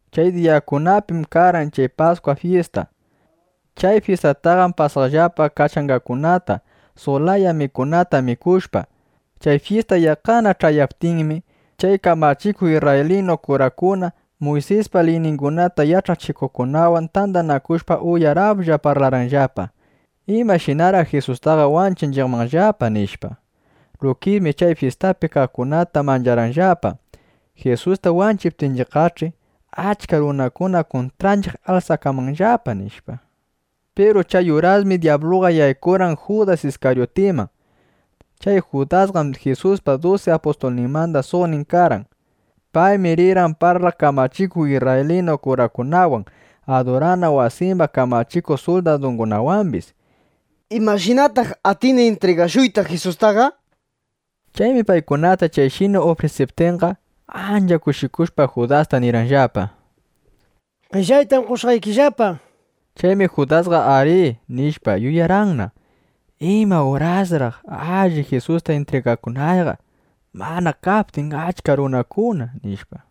Chay diyakunapim karqan chay Paskwa fyista. Chay fyistataqam pasaqllapa kachangakunata, suq laya mikunata mikushpa. Chay fyista yaqqana ch'ayaptinmi, chay kamachikuq isrraylinu kurakuna Muysispa liyningunata yach'achikuqkunawan tandanakushpa, uyaraplla (uyaralla) parlarqanllapa: —¿Imashinaraq Jisustaqa wanchinchiqmanllapa? nishpa. Lukismi chay fyistapi kaqkunata mancharqanllapa. (Jisusta wanchiptinchiqqach'i, achka runakuna kuntranchiq alsakanmanllapa, nishpa.) Piru chay urasmi dyabluqa yaykurqan Judas Iskaryutiman. Chay Judasqam Jisuspa dusi apustulninmanda suqnin karqan. Paymi rirqan parlaq kamachikuq isrraylinu kurakunawan, adurana wasimba kamachikuq suldadungunawambis: —¿Imashinataq atini intrigashuyta Jisustaqa? nishpa. Chaymi paykunata chayshina ufrisiptinqa, ancha kushikushpa, Judasta nirqanllapa: —Qellaytam qoshqaykillapa, nishpa. Chaymi Judasqa ari, nishpa, yuyarqan: ¿Ima urasraq alli Jisusta intrigakunayqa, mana kaptin achka runakuna? nishpa.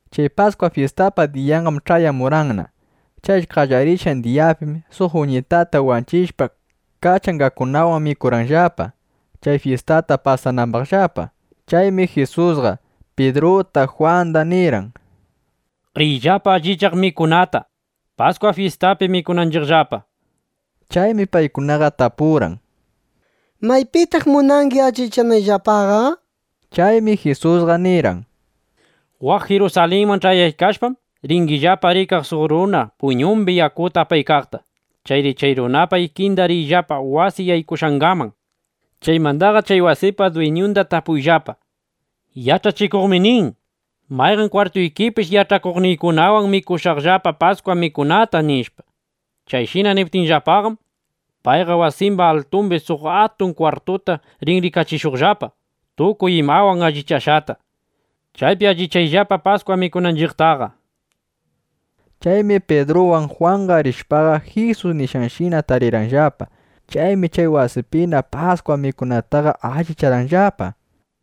Chay Paskwa fyistapa diyanqam ch'ayamurqanna. Chay qallarishqan diyapim suq uñitata wanchishpa, kachangakunawan mikurqanllapa, chay fyistata pasanambaqllapa. Chaymi Jisusqa Pidruta Jwanda nirqan: —Riyllapa allichaq mikunata, Paskwa fyistapi mikunanchiqllapa, nishpa. Chaymi paykunaqa tapurqan: —¿Maypitaq munangi allichanayllapaqa? nishpa. Chaymi Jisusqa nirqan: —Waq Jirusalinman ch'ayaykashpam, ringillapa rikaq suq runa puyñumbi yakuta apaykaqta. Chayri chay runapa ikinda riyllapa wasi yaykushqangaman. Chaymandaqa chay wasipa dwiñunda tapuyllapa: “Yach'achikuqmi nin: ¿Mayqan kwartuykipish yach'akuqniykunawan mikushaqllapa Paskwa mikunata?” nishpa. Chayshina niptikillapaqam, payqa wasimba altumbi suq atun kwartunda rin rikachishuqllapa tukuy imawan allichashqata. Chaypi allichayllapa Paskwa mikunanchiqtaqa, nishpa. Chaymi Pidruwan Jwan rishpaqa, Jisus nishqanshina tarirqanllapa. Chaymi chay wasipina Paskwa mikunataqa allicharqanllapa.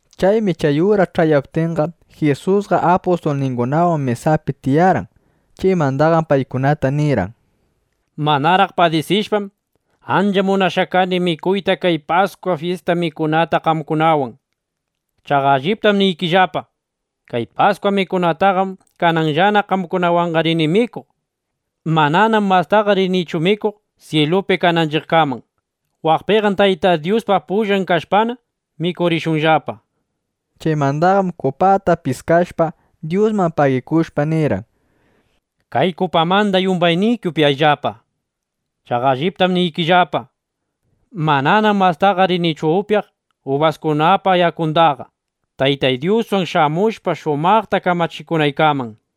Chaymi chay uras ch'ayaptinqa, Jisusqa apustulningunawan mesapi tiyarqan. Chaymandaqam paykunata nirqan: —¡Manaraq padisishpam, ancha munashqa kani mikuyta kay Paskwa fyista mikunata qamkunawan! Chaqa alliptam niykillapa, kay Paskwa mikunataqam kananllana qamkunawanqa rini mikuq. Mananam mastaqa rinichu mikuq syilupi kananchiqkaman. Waqpiqam Taytay Dyuspa pullan kashpana, mikurishunllapa, nishpa. Chaymandaqam kupata piskashpa, Dyusman pagikushpa, nirqan: —Kay kupamanda yumbayniki upyayllapa. Chaqa alliptam niykillapa, mananam mastaqa rinichu upyaq ubaskunapa yakundaqa, Taytay Dyuswan shamushpa, shumaqta kamachikunaykaman, nishpa.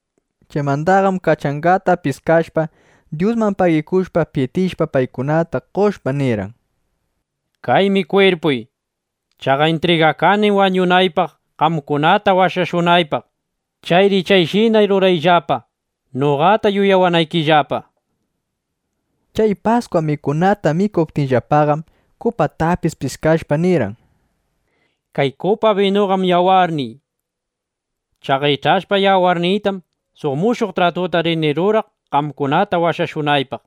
Chaymandaqam kachangata piskashpa, Dyusman pagikushpa, pitishpa, paykunata qoshpa, nirqan: —Kaymi kwirpuy. Chaqa intrigakanim wañunaypaq, qamkunata washashunaypaq. Chayri kayshina rurayllapa, noqata yuyawanaykillapa, nishpa. Chay Paskwa mikunata mikuptinllapaqam, kupatapis piskashpa nirqan: —Kay kupa binuqam yawarniy. Chaqa ich'ashpa yawarniytam, suq mushuq tratuta rini ruraq, qamkunata washashunaypaq.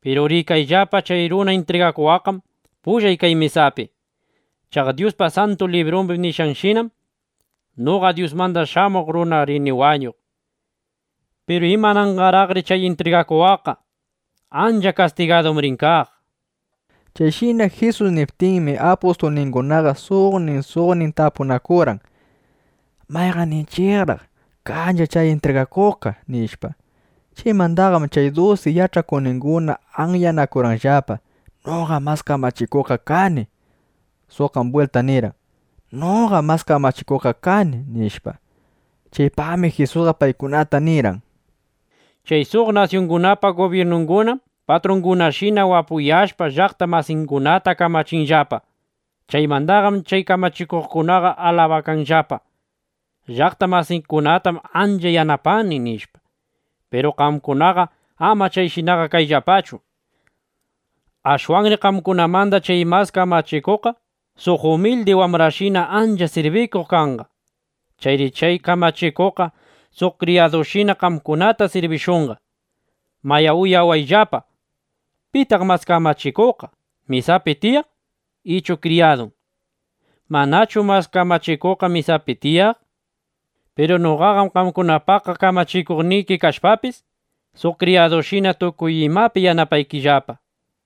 ’Piru rikayllapa, chay runa intrigakuwaqqam pullay kay mesapi. Chaqa Dyuspa Santu Librumbi nishqanshinam, noqa Dyusmanda Shamuq Runaqa rini wañuq. ¡Piru imananqaraqri chay intrigakuwaqqa! Ancha kastigadum rin kaq, nishpa. Chayshina Jisus niptinmi, apustulningunaqa suqnin, suqnin tapunakurqan: —¿Mayqanninchiqraq kanchiq chay intrigakuqqa? nishpa. Chaymandaqam chay dusi yach'akuqninguna anyanakurqanllapa: —Noqam mas kamachikuqqa kani. Suqqam bwilta nirqan: —Noqam mas kamachikuqqa kani, nishpa. Chaypaqmi Jisusqa paykunata nirqan: —Chay suq nasyungunapa gubyirnungunam patrungunashina wapuyashpa, llaqta masingunata kamachinllapa. Chaymandaqam chay kamachikuqkunaqa alabakanllapa: “Llaqta masiykunatam ancha yanapani”, nishpa. Piru qamkunaqa ama chayshinaqa kayllapachu. Ashwanri qamkunamanda chay mas kamachikuqqa suq umildi wambrashina ancha sirbikuq kanqa. Chayri chay kamachikuqqa suq kriyadushina qamkunata sirbishunqa. Mayá, yuyayllapa: ¿Pitaq mas kamachikuqqa, mesapi tiyaq ichu kriyadun? ¿Manachu mas kamachikuqqa mesapi tiyaq? Piru noqaqam qamkunapa kamachikuqniki kashpapis, suq kriyadushina tukuy imapi yanapaykillapa.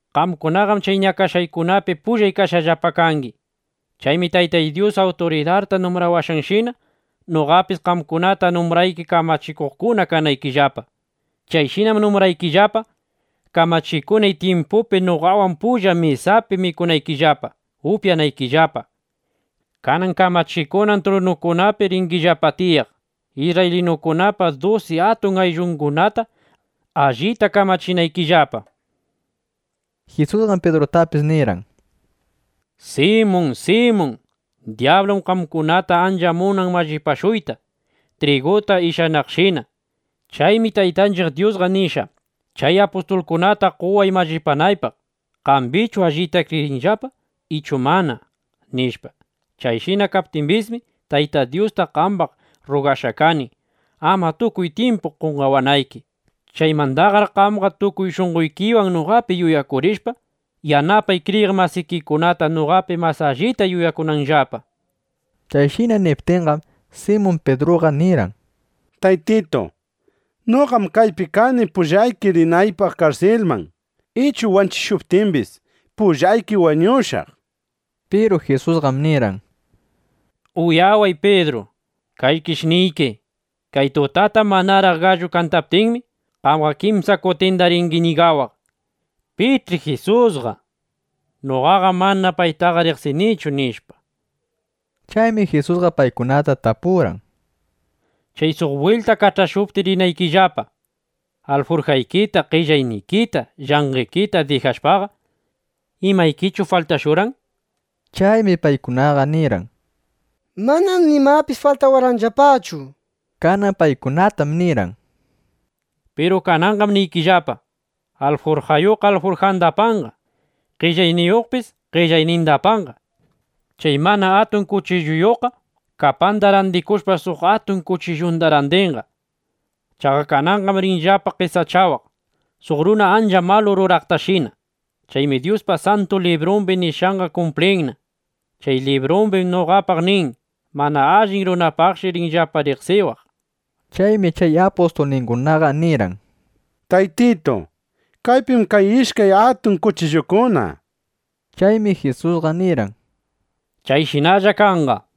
’Qamkunaqam chay ñakashqaykunapi pullay kashqallapa kangi. Chaymi Taytay Dyus awturidarta numbrawashqanshina, noqapis qamkunata numbrayki, kamachikuqkuna kanaykillapa. Chayshinam numbraykillapa, kamachikunay tyimpupi noqawan pulla mesaypi mikunaykillapa, upyanaykillapa. Kanan kamachikunan trunukunapi ringillapa tiyaq, isrraylinukunapa dusi atun ayllungunata allita kamachinaykillapa, nishpa. Jisusqam Pidrutapis nirqan: —Simun, Simun, dyablum qamkunata ancha munan mallipashuyta, triguta ishanaqshina. Chaymi Taytanchiq Dyusta nishqa: “Chay apustulkunata qoway mallipanaypaq, ¿qambichu allita kriyinllapa ichu mana?” nishpa. Chayshina kaptimbismi, Tayta Dyusta qambaq rrugashqa kani, ama tukuy tyimpu qonqawanayki. Chaymandaqar qamqa tukuy shunqoykiwan noqapi yuyakurishpa, yanapay kriyiq masikikunata, noqapi mas allita yuyakunanllapa. Chayshina niptinqam, Simun Pidruqa nirqan: —Taytitu, noqam kaypi kani pullayki rinaypaq karsilman, ichu wanchishuptimbis, pullayki wañushaq, nishpa. Piru Jisusqam nirqan: —Uyaway Pidru, kaykish niyki, kay tutatam manaraq gallu kantaptin, qamqa kimsa kutinda ringi ñigawaq: “¿Pich'i Jisusqa? Noqaqam mana paytaqa riqsinichu”, nishpa. Chaymi Jisusqa paykunata tapurqan: —Chay suq bwilta kach'ashuptiy rinaykillapa, alfurjaykita, qellaynikita, llanqekita dijashpaqa, ¿imaykichu faltashurqan? nishpa. Chaymi paykunaqa nirqan: —Manam nimapis faltawarqanllapachu, nishpa. Kanan paykunatam nirqan: —Piru kananqam niykillapa, alfurjayuqqa alfurjanda apanqa. Qellayniyuqpis qellayninda apanqa. Chay mana atun kuchilluyuqqa kapanda randikushpa, suq atun kuchillunda randinqa. Chaqa kananqam rinllapana qesachawaq, suq runa ancha malu ruraqtashina. Chaymi Dyuspa Santu Librumbi nishqanqa kumplinna. Chay librumbim noqapaq nin: “Mana allin runapaqshi rinllapa riqsiq”, nishpa. Chaymi chay apustulningunaqa nirqan: —Taytitu, kaypim kan ishkay atun kuchillukuna, nishpa. Chaymi Jisusqa nirqan: —Chayshinalla kanqa, nishpa.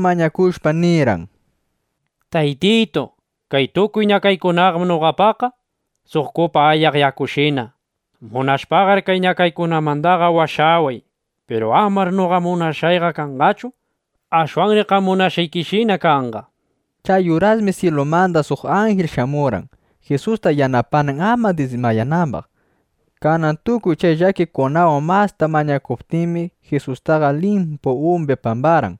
mañakushpa nirqan: —Taytitu, kay tukuy ñakaykunaqam noqapaqqa suq kupa ayaq yakushina. Munashpaqar kay ñakaykunamanda washaway. Piru amar noqa munashqayqa kanqachu. Ashwanri qam munashqaykishina kanqa, nishpa. Chay urasmi syilumanda suq anjil shamurqan Jisusta yanapanan, ama dismayanambaq. Kanan tukuy chay llakikunawan masta mañakuptinmi, Jisustaqa limpu umbi pambarqan.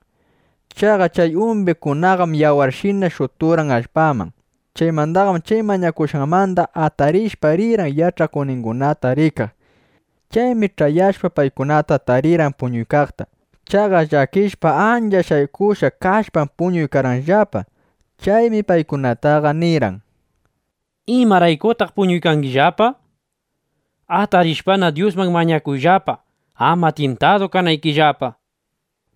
Chaqa chay umbishqangunaqam yawarshina shuturqan allpaman. Chaymandaqam chay mañakushqanmanda atarishpa, rirqan yach'akuqningunata rikaq. Chaymi ch'ayashpaqa, paykunata tarirqan puñuykaqta. Chaqa llakishpa, ancha shaykushqa kashpam, puñuykarqanllapa. Chaymi paykunataqa nirqan: —¿Imaraykutaq puñuykangillapa? Atarishpana, Dyusman mañakuyllapa, ama tyintadu kanaykillapa, nishpa.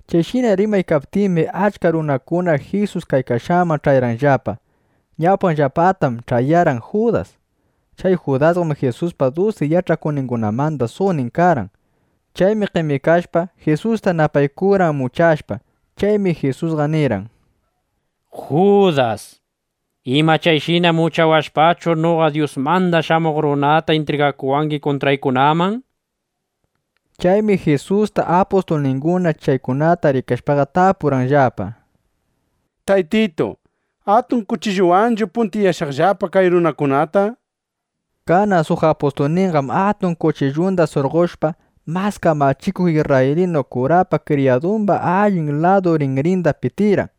Chayshina rimaykaptinmi, achka runakuna Jisus kaykashqanman ch'ayarqanllapa. Ñawpanllapataqam ch'ayarqan Judas. Chay Judasqam Jisuspa dusi yach'akuqningunamanda suqnin karqan. Paymi qemikashpa, Jisusta napaykurqan muchashpa. Chaymi Jisusqa nirqan: —Judas, ¿ima chayshina muchawashpachu, noqa Dyusmanda Shamuq Runataqa intrigakuwangi kuntrawaqkunaman? nishpa. Chaymi Jisuspa apustulninguna chaykunata rikashpaqa, tapurqanllapa: —Taytitu, ¿atun kuchilluwanchu puntiyashaqllapa kay runakunata? nishpa. Kanan suq apustulninqam atun kuchillunda surqoshpa, mas kamachikuq isrraylinu kurapa kriyadumba allin ladu rinrinda pitirqan.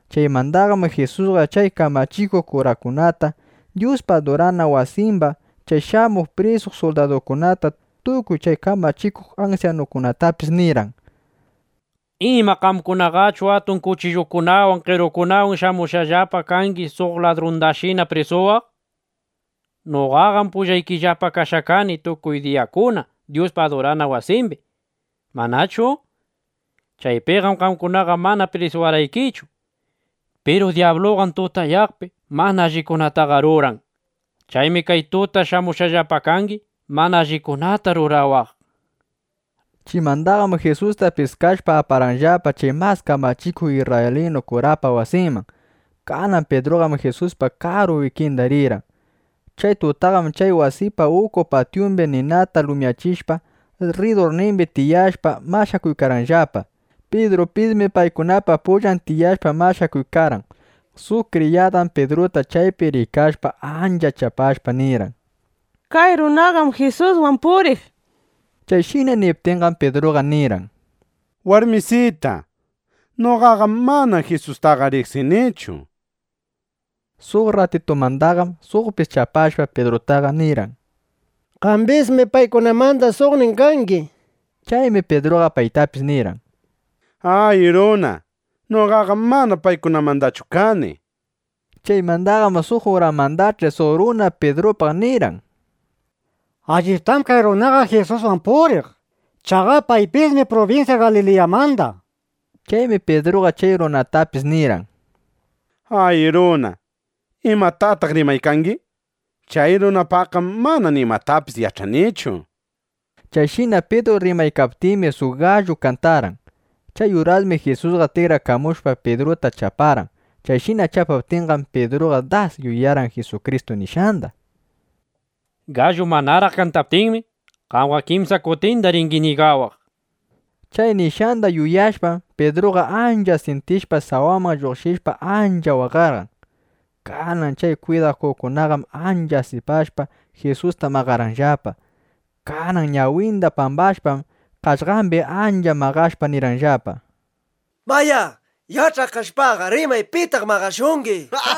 Chaymandaqam Jisusqa chay kamachikuq kurakunata, Dyuspa adurana wasimba chay shamuq prisuq suldadungunata, tukuy chay kamachikuq ansyanukunatapis nirqan: —¿Ima qamkunaqachu atun kuchillukunawan, qerukunawan shamushqallapa kangi suq ladrundashina prisuwaq? Noqaqam pullaykillapa kashqa kani tukuy diyakuna Dyuspa adurana wasimbi, ¿manachu? Chaypiqam qamkunaqa mana prisuwarqaykichu. Piru dyabluqam tutayaqpi mana allikunataqa ruran. Chaymi kay tuta shamushqallapa kangi, mana allikunata rurawaqqa, nishpa. Chaymandaqam Jisusta piskashpa, aparqanllapa chay mas kamachikuq isrraylinu kurapa wasinman. Kanan Pidruqam Jisuspa karu ikinda rirqan. Chay tutaqam chay wasipa uku patyumbi ninata lumyachishpa, rridurnimbi tiyashpa mashakuykarqanllapa. Pidrupismi paykunapa pullan tiyashpa mashakuykarqan. Suq kriyadam Pidruta chaypi rikashpa, ancha chapashpa nirqan: —Kay runaqam Jisuswan puriq, nishpa. Chayshina niptinqam, Pidruqam nirqan: —Warmisita, noqaqam mana Jisustaqa riqsinichu, nishpa. Suq rratitumandaqam suqpis chapashpa, Pidrutaqa nirqan: —Qambismi paykunamanda suqnin kangi, nishpa. Chaymi Pidruqa paytapis nirqan: —Ay runa, noqaqam mana paykunamandachu kani, nishpa. Chaymandaqam suq uramandach'i suq runa Pidrupaq nirqan: —Alliptam kay runaqa Jisuswan puriq. Chaqa paypismi prubinsya Galiliyamanda, nishpa. Chaymi Pidruqa chay runatapis nirqan: —Ay runa, ¿imatataq rimaykangi? Chay runapaqqam mana nimatapis yach'anichu, nishpa. Chayshina Pidru rimaykaptinmi, suq gallu kantarqan. Chay urasmi Jisusqa tikrakamushpa, Pidruta chaparqan. Chayshina chapaptinqam, Pidruqa das yuyarqan Jisukristu nishqanda: “Gallu manaraq kantaptinmi, qamqa kimsa kutinda ringi ñigawaq”, nishpa. Chay nishqanda yuyashpam, Pidruqa ancha syintishpa, sawaman lluqshishpa, ancha waqarqan. Kanan chay kwidakuqkunaqam ancha asipashpa, Jisusta maqarqanllapa. Kanan ñawinda pambashpam, qaqllambi ancha maqashpa, nirqanllapa: —¡Mayá, yach'aq kashpaqa, rimay pitaq maqashungi! nishpa.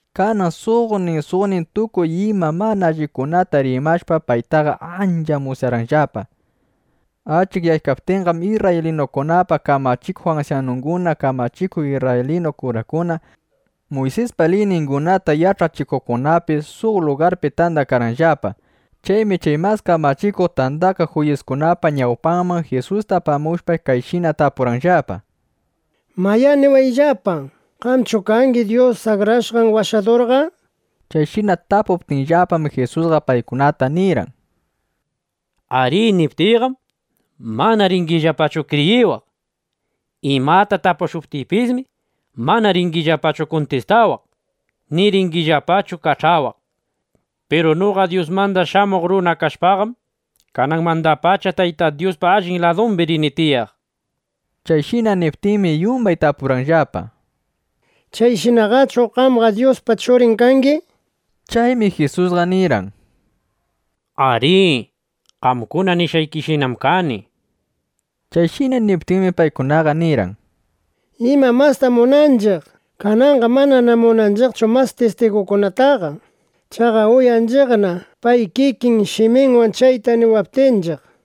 Kanan suqnin suqnin tukuy ima mana allikunata rimashpa, paytaqa ancha musyarqanllapa. Achikyaptinqam, isrraylinukunapa kamachikuq ansyanunguna, kamachikuq isrraylinu kurakuna, Muysispa liyningunata yach'achikuqkunapis suq lugarpi tandakarqanllapa. Chaymi chay Mas Kamachikuq Tandakaq Juyiskunapa ñawpanman Jisusta apamushpa, kayshina tapurqanllapa: —Mayá, niwayllapa, ¿Qamchu kangi Dyus Akrashqan Washadurqa? Chayshina tapuptinllapam, Jisusqa paykunata nirqan: —Ari niptiyqam, mana ringillapachu kriyiwaq. Imata tapushuptiypismi, mana ringillapachu kuntistawaq, ni ringillapachu kach'awaq. Piru noqa Dyusmanda Shamuq Runa kashpaqam, kananmandapacha Tayta Dyuspa allin ladumbi rini tiyaq. Chayshina niptinmi, yumbay tapurqanllapa: —¿Chayshinaqachu qamqa Dyuspa Churin kangi? nishpa. Chaymi Jisusqa nirqan: —Arí, qamkuna nishqaykishinam kani, nishpa. Chayshina niptinmi, paykunaqa nirqan: —¿Ima mastam munanchiq? Kananqam manana munanchiqchu mas tistigukunataqa. Chaqa uyanchiqna, pay kikin shiminwan chayta niwaptinchiq, nishpa.